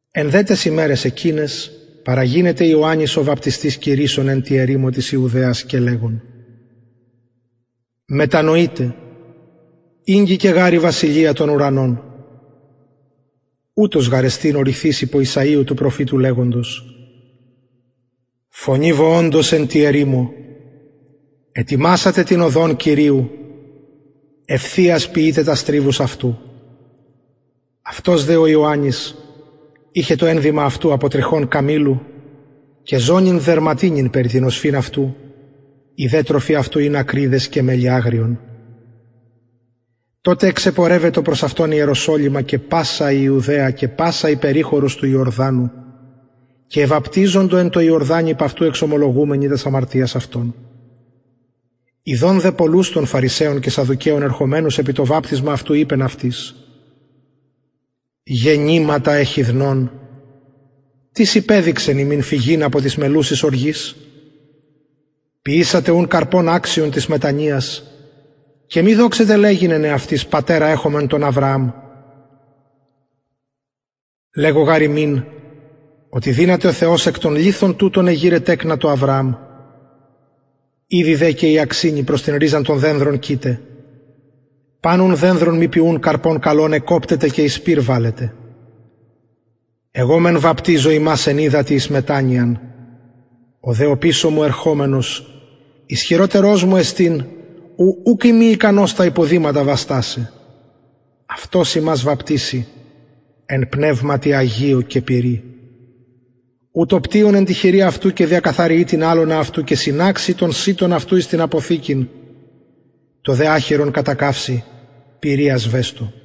εν δε ταις ημεραις εκειναις παραγινεται ιωαννης ο βαπτιστης κηρυσσων εν τη ερημω της ιουδαιας και λεγων μετανοειτε ηγγικεν γαρ η βασιλεια των ουρανων ουτος γαρ εστιν ο ρηθεις υπο ησαιου του προφητου λεγοντος φωνη βοωντος εν τη ερημω ετοιμασατε την οδον κυριου ευθειας ποιειτε τας τριβους αυτου αυτος δε ο ιωαννης ειχεν το ενδυμα αυτου απο τριχων καμηλου και ζωνην δερματινην περι την οσφυν αυτου η δε τροφη αυτου ην ακριδες και μελι αγριον τοτε εξεπορευετο προς αυτον ιεροσολυμα και πασα η ιουδαια και πασα η περιχωρος του ιορδανου και εβαπτιζοντο εν τω ιορδανη υπ αυτου εξομολογουμενοι τας αμαρτιας αυτων ιδων δε πολλους των φαρισαιων και σαδδουκαιων ερχομενους επι το βαπτισμα αυτου ειπεν αυτοις γεννηματα εχιδνων τις υπεδειξεν υμιν φυγειν απο της μελλουσης οργης ποιησατε ουν καρπον αξιον της μετανοιας και μη δοξητε λεγειν εν εαυτοις πατερα εχομεν τον αβρααμ λεγω γαρ υμιν οτι δυναται ο θεος εκ των λιθων τουτων εγειραι τεκνα τω αβρααμ ηδη δε και η αξινη προς την ριζαν των δενδρων κειται παν ουν δενδρον μη ποιουν καρπον καλον εκκοπτεται και εις πυρ βαλλεται εγω μεν βαπτιζω υμας εν υδατι εις μετανοιαν ο δε οπισω μου ερχομενος ισχυροτερος μου εστιν ου ουκ ειμι ικανος τα υποδηματα βαστασαι αυτος υμας βαπτισει εν πνευματι αγιω ου το πτυον εν τη χειρι αυτου και διακαθαριει την αλωνα αυτου και συναξει τον σιτον αυτου εις την αποθηκην το δε αχυρον κατακαυσει πυρι ασβεστω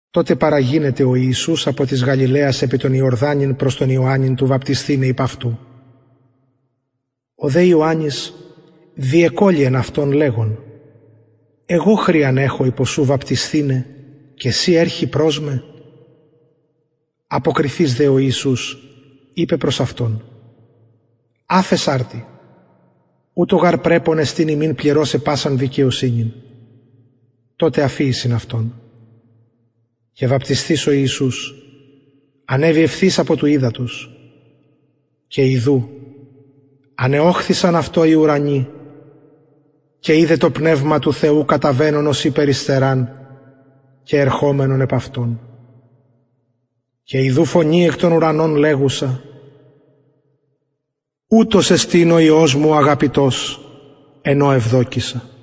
τοτε παραγινεται ο ιησους απο της γαλιλαιας επι τον ιορδανην προς τον ιωαννην του βαπτισθηναι υπ αυτου ο δε ιωαννης διεκωλυεν αυτον λεγων εγω χρειαν εχω υπο σου βαπτισθηναι και συ ερχη προς με αποκριθεις δε ο ιησους ειπεν προς αυτον αφες αρτι ουτως γαρ πρεπον εστιν ημιν πληρωσαι πασαν δικαιοσυνην τοτε αφιησιν αυτον και βαπτισθεις ο ιησους ανεβη ευθυς απο του υδατος και ιδου ανεωχθησαν αυτω οι ουρανοι και ειδεν το πνευμα του θεου καταβαινον ωσει περιστεραν και ερχομενον επ αυτον και ιδου φωνη εκ των ουρανων λεγουσα ουτος εστιν ο υιος μου ο αγαπητος εν ω ευδοκησα